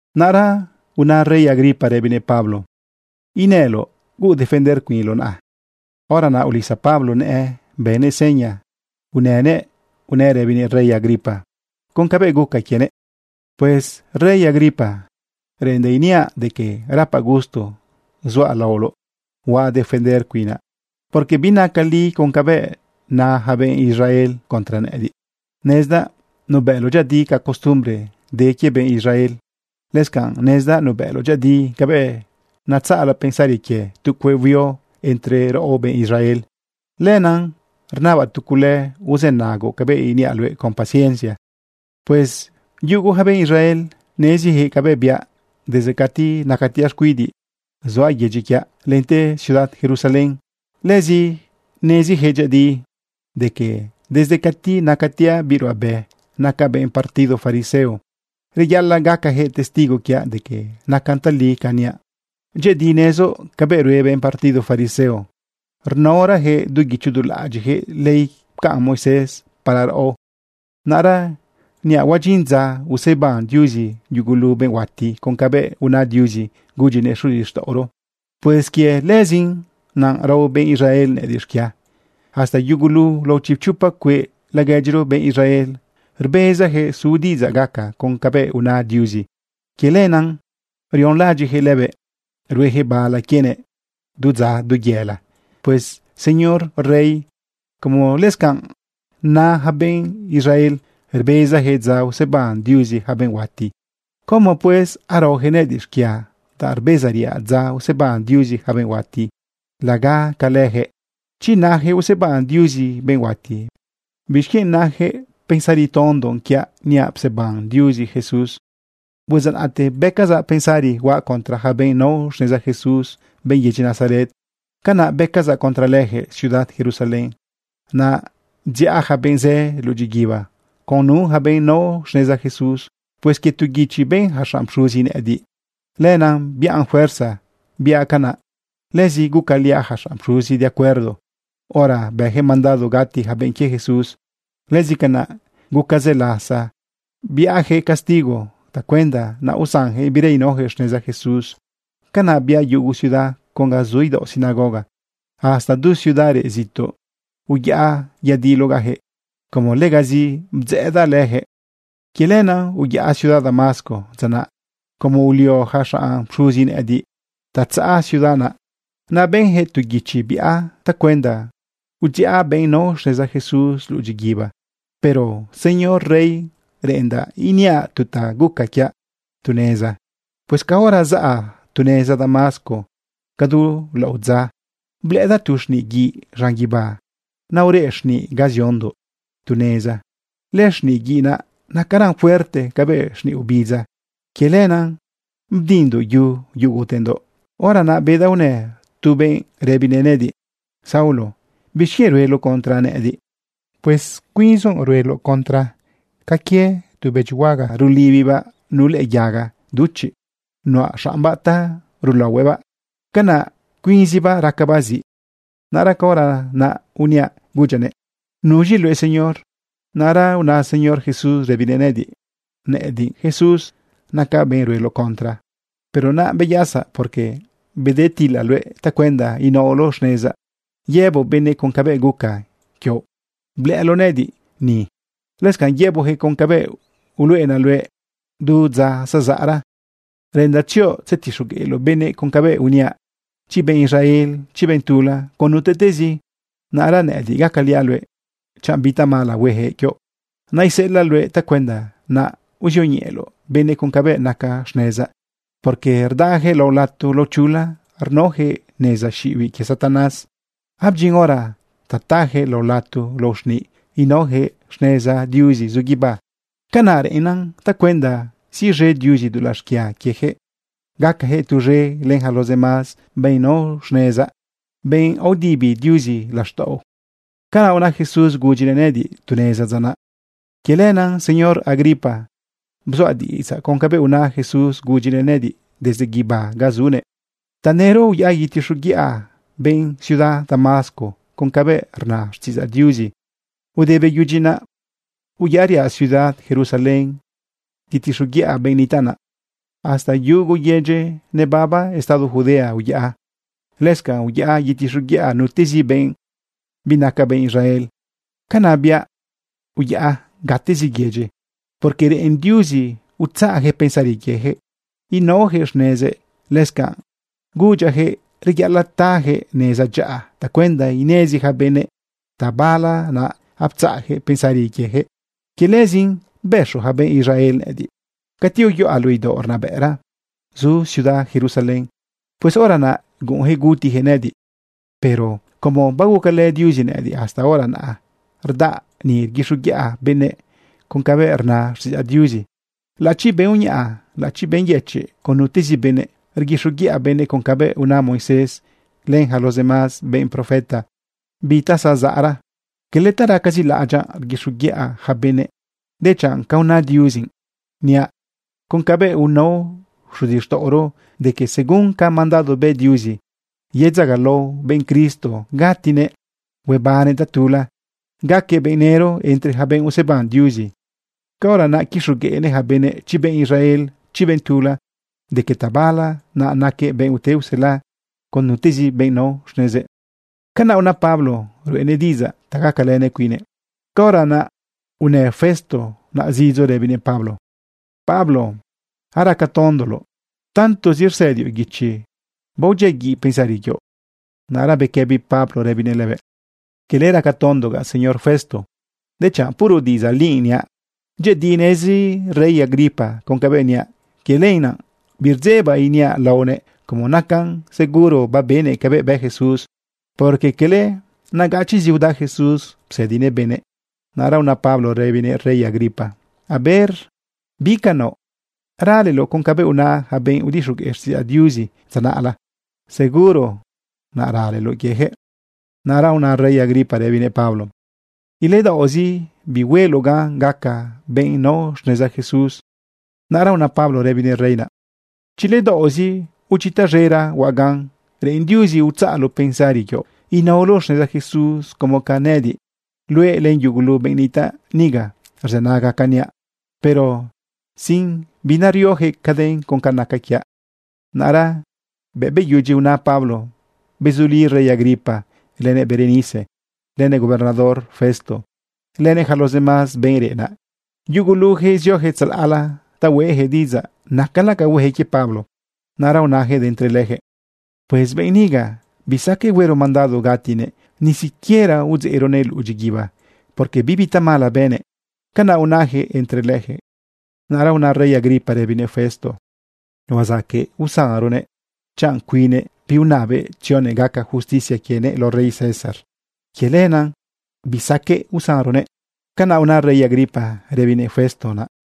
Naꞌra una rey Agripa rëbinëꞌ Pablo: ―Inëloꞌ huuꞌ defender cuinloꞌ naꞌa. Hora naꞌ ulisa Pablo nëꞌë bënëꞌ seña inënëꞌ unëꞌ rëbinëꞌ rey Agripa con cabëꞌ guca quienëꞌ: ―Pues rey Agripa, reꞌendaꞌ iniaꞌ de que rapaꞌ gusto zuaꞌ laoloꞌ huaꞌ defender cuinaꞌ, porque binacan li con cabëꞌ na yaca benꞌ Israel contra nëꞌëdiꞌ. Nezdaꞌ nubëꞌloꞌ dyëꞌëdi ca costumbre de quie benꞌ Israel. Lëscanꞌ nezdaꞌ nubëꞌloꞌ dyëꞌëdi cabëꞌ natzaꞌla pensari quie tu cueꞌ huio entre raꞌo benꞌ Israel. Lenaꞌ rnabaꞌ tu cule uzënagoꞌ cabëꞌ iniaꞌ luëꞌ con paciencia. ’Pues yugu ja benꞌ Israel nezijëꞌ cabëꞌ biaꞌ desde cati nacatiaꞌ xcuidiꞌ zuaꞌ yedyi quiaꞌ, lente ciudad Jerusalén. Lëzi nezijëꞌ dyëꞌëdi de que desde cati nacatiaꞌ biꞌ ruꞌabe, nacaꞌ benꞌ partido fariseo. Reyaꞌalaꞌ gacajëꞌ testigo quiaꞌ de que nacan tali ca niaꞌ. Dyëꞌëdi nezoꞌ cabëꞌ rue benꞌ partido fariseo rnaorayaquëꞌ du guicho du laꞌadyiꞌjëꞌ ley pcaꞌn Moisés para raꞌo. Naꞌra niaꞌ huadyin dza useban Diuzi yugulu benꞌ huati con cabëꞌ una Diuzi gudyinëꞌ xuzixtaꞌoro. Pues quie lëzin naꞌ rao benꞌ Israel nëꞌëdiꞌ xquia. Hasta yugulu lao chipchopa cueꞌ laguedyiro benꞌ Israel rbezayaquëꞌ su diꞌidzaꞌ gaca con cabëꞌ una Diuzi. Quie lenaꞌ rionlaꞌadyiꞌyaquëꞌ lëbëꞌ rueyaquëꞌ bala quienëꞌ du dza, du yëla. Pues Señor Rey, como lëscanꞌ na yaca benꞌ Israel rbezayaquëꞌ dza useban Diuzi yaca benꞌ huati, ¿cómo, pues, araoyaquëꞌ nëꞌëdiꞌ xquia danꞌ rbezariaꞌ dza useban Diuzi yaca benꞌ huati laga ca leyaquëꞌ? Chi nayaquëꞌ useban Diuzi benꞌ huati, ¿bixquienꞌ nayaquëꞌ pensari tondo quiaꞌ niaꞌ pseban Diuzi Jesús? ’Pues dza naꞌte bëcazaꞌ pensari huaꞌ contra yaca benꞌ nao xneza Jesús, benꞌ yedyi Nazaret. Canaꞌ bëcazaꞌ contra lejëꞌ ciudad Jerusalén. Naꞌ bdziꞌa yaca benꞌ zë luꞌu dyiguiba con nu ja benꞌ nao xneza Jesús. Pues quie tu guichi ben ja xanꞌ pxuzi nëꞌëdiꞌ, lenaꞌ biꞌan fuerza biaꞌ canaꞌ. Lëzi gucaliaꞌ ja xanꞌ pxuzi de acuerdo hora bëyaquëꞌ mandado gati yaca benꞌ quie Jesús. Lëzi canaꞌ guca zë lasa biaꞌyaquëꞌ castigo tacuenda naꞌ usanjëꞌ bira inaoyaquëꞌ xneza Jesús. Canaꞌ biaꞌ yugu ciudad con ga zu idaoꞌ sinagoga. Hasta du ciudad reꞌ zituꞌ uyaꞌa yadilogaꞌyaquëꞌ como legazi bdzëꞌëdaꞌ leyaquëꞌ. ’Quie lenaꞌ, uyaꞌa ciudad Damasco dza naꞌ, como ulio ja xanꞌ pxuzi nëꞌëdiꞌ ta tzaꞌa ciudad naꞌ. Naꞌ benjëꞌ tu guichi biaꞌ tacuenda udziꞌa benꞌ nao xneza Jesús luꞌu dyiguiba. Pero, señor rey, reꞌendaꞌ iniaꞌ tu ta guca quiaꞌ tu neza. Pues caora zaꞌa tu neza Damasco cadu laꞌodza, blëꞌëdaꞌ tu xniꞌ guiꞌ zaꞌn guibá. Naꞌ ureꞌ xniꞌ ga ziondoꞌ tu neza naꞌ. Lëxniꞌ guiꞌ naꞌ nacaran fuerte cabëꞌ xniꞌ obidza. Quie lenaꞌ bdindoꞌ yu yugutendoꞌ. Hora naꞌ bedaꞌ unë tu benꞌ rëbinëꞌ nëꞌëdiꞌ: “Saulo, ¿bixquienꞌ rueloꞌ contra nëꞌëdiꞌ? Pues cuinzoꞌ rueloꞌ contra ca quie tu bëdyihuaga rulibibaꞌ nu lëꞌë yaga duchiꞌ nuꞌa xaꞌmbaꞌ ta rulaohuëꞌbaꞌ, canaꞌ cuinzibaꞌ racabaꞌ ziꞌ.” Naꞌra caora naꞌ uniaꞌ gudyaꞌnëꞌ: “¿Nuz̃i luëꞌ, Señor?” Naꞌra una Señor Jesús rëbinëꞌ nëꞌëdiꞌ: “Nëꞌëdiꞌ Jesús. Nacaꞌ benꞌ rueloꞌ contra. Pero naꞌ beyasa, porque bedetilaꞌ luëꞌ tacuenda inaoloꞌ xnezaꞌ yëboꞌ benëꞌ con cabëꞌ guca quioꞌ blëꞌëloꞌ nëꞌëdiꞌ ni. Lëscanꞌ yëboꞌyaquëꞌ con cabëꞌ uluꞌenaꞌ luëꞌ du dza zezaꞌra. Reꞌendaꞌ tzioꞌ tzetixogueꞌloꞌ benëꞌ con cabëꞌ uniaꞌ, chi benꞌ Israel, chi benꞌ tula, con nutezi. Naꞌra nëꞌëdiꞌ gacaliaꞌ luëꞌ chanꞌ bi tamala hueyaquëꞌ quioꞌ. Naꞌ iseꞌelaꞌ luëꞌ tacuenda naꞌ uzioñeꞌeloꞌ benëꞌ con cabëꞌ naca xnezaꞌ, porque rdayaquëꞌ lao lato lao chula rnaojëꞌ neza xiꞌibiꞌ quie Satanás. Abdyin hora ta tayaquëꞌ lao lato lao xniꞌ inaojëꞌ xneza Diuzi zu guibá. Canaꞌ reꞌennan tacuenda siꞌz̃e Diuzi dulaꞌ xquia quiejëꞌ gacajëꞌ tuz̃e len yaca los demás benꞌ nao xnezaꞌ, benꞌ aodibi Diuzi laxtaꞌo.” Canaꞌ una Jesús gudyinëꞌ nëꞌëdiꞌ tu neza dza naꞌ. ’Quie lenaꞌ, señor rey Agripa, bzuaꞌ diꞌidzaꞌ con cabëꞌ una Jesús gudyinëꞌ nëꞌëdiꞌ desde guibá ga zunëꞌ. Tanëro uyaꞌa yetixoguiꞌa benꞌ ciudad Damasco con cabëꞌ rna xtiꞌidzaꞌ Diuzi. Ude beyudyi naꞌ, uyaꞌriaꞌ ciudad Jerusalén yetixoguiꞌa benꞌ nitaꞌ naꞌ. Hasta yugu yedyi nebaba estado Judea uyaꞌ. Lëscanꞌ uyaꞌa yetixoguiꞌa nutezi benꞌ binaca benꞌ Israel. Canaꞌ biaꞌ uyaꞌa gatezi yedyi, porque reꞌen Diuzi utzaꞌjëꞌ pensari quiejëꞌ inaojëꞌ xnezëꞌ. Lëscanꞌ gudyaꞌyaquëꞌ reyaꞌalaꞌ tajëꞌ neza dyaꞌa tacuenda inezi ja benëꞌ tabala naꞌ aptzaꞌjëꞌ pensari quiejëꞌ. Quie lëzin bëxo ja benꞌ Israel nëꞌëdiꞌ cati uyuꞌa luꞌu idaoꞌ rnabëꞌra zu ciudad Jerusalén. Pues hora naꞌ guꞌunyaquëꞌ gutiyaquëꞌ nëꞌëdiꞌ. Pero como bagucalë Diuzi nëꞌëdiꞌ, hasta hora naꞌ rdaꞌa ni rguixoguiꞌa benëꞌ con cabëꞌ rna xtiꞌidzaꞌ Diuzi, laꞌachi benꞌ uñaꞌa, laꞌachi benꞌ yëchiꞌ, con nutezi benëꞌ. Rguixoguiꞌa benëꞌ con cabëꞌ una Moisés len yaca los demás benꞌ profeta bi ta zazaꞌra. Quele ta racazi laꞌadyaꞌ rguixoguiꞌa yaca benëꞌ, dechanꞌ ca una Diuzi. Niaꞌ con cabëꞌ unao xuzixtaꞌoro de que según ca mandado bë Diuzi, yedzagalao benꞌ Cristo gatinëꞌ huebannëꞌ tatula gaquëꞌ benꞌ nëro entre yaca benꞌ useban Diuzi. Caora naꞌ quixogueꞌnëꞌ ja benëꞌ, chi benꞌ Israel, chi benꞌ tula, de que tabala naꞌ naquëꞌ benꞌ ute usela con nutezi benꞌ nao xnezëꞌ. Canaꞌ una Pablo ruꞌenëꞌ diꞌidzaꞌ ta gacalenëꞌ cuinnëꞌ. Caora naꞌ unë Festo naꞌ zidzo rëbinëꞌ Pablo: ―¡Pablo, aracatondoloꞌ! Tantozi rsëdioꞌ guichi, baodyiaguiꞌ pensari quioꞌ. Naꞌra bequëbi Pablo rëbinëꞌ lëbëꞌ: ―Quele racatondogaꞌ, señor Festo, dechanꞌ puro diꞌidzaꞌ li niaꞌ. Dyëꞌëdi nezi rey Agripa con cabëꞌ niaꞌ. Quie lenaꞌ birdzebaꞌ iniaꞌ laonëꞌ como nacan seguro babenëꞌ cabëꞌ bë Jesús, porque cala nagachiꞌzi uda Jesús psëdinëꞌ benëꞌ. Naꞌra una Pablo rëbinëꞌ rey Agripa: ―A ver bi ca naoꞌ. ¿Raleloꞌ con cabëꞌ una yaca benꞌ udixogueꞌ xtiꞌidzaꞌ Diuzi dza naꞌla? Seguro naꞌ raleloꞌ quiejëꞌ. Naꞌra una rey Agripa rëbinëꞌ Pablo: ―Iledaoꞌzi bihueloꞌ gan gacaꞌ benꞌ nao xneza Jesús. Naꞌra una Pablo rëbinëꞌ rey naꞌ: ―Chi ledaoꞌzi o chi taz̃era huaꞌ gan, reꞌen Diuzi utzaꞌloꞌ pensari quioꞌ inaoloꞌ xneza Jesús como ca nëꞌëdiꞌ, luëꞌ len yugulu benꞌ nitaꞌ niga rzënaga ca niaꞌ, pero sin narioyaquëꞌ caden con ca naca quiaꞌ. Naꞌra bëꞌ beyudyi una Pablo, bezuli rey Agripa lënëꞌ Berenice lënëꞌ gobernador Festo lënëꞌ yaca los demás benꞌ reꞌ naꞌ. Yugulujëꞌ ziojëꞌ tzalaꞌla ta hueꞌjëꞌ diꞌidzaꞌ nacala ca huejëꞌ quie Pablo. Naꞌra unajëꞌ de entre lejëꞌ: ―Pues benꞌ niga, bisaqueꞌ huero mandado gatinëꞌ, ni siquiera udzeꞌronëꞌ luꞌu dyiguiba, porque bibi tamala bënëꞌ. ―Canaꞌ unajëꞌ entre lejëꞌ. Naꞌra una rey Agripa rëbinëꞌ Festo: ―Huazaqueꞌ usanronëꞌ chanꞌ cuinnëꞌ biunabëꞌ tzionëꞌ gaca justicia quienëꞌ lao rey César. Quie lenaꞌ bisaqueꞌ usanronëꞌ. ―Canaꞌ una rey Agripa rëbinëꞌ Festo naꞌ.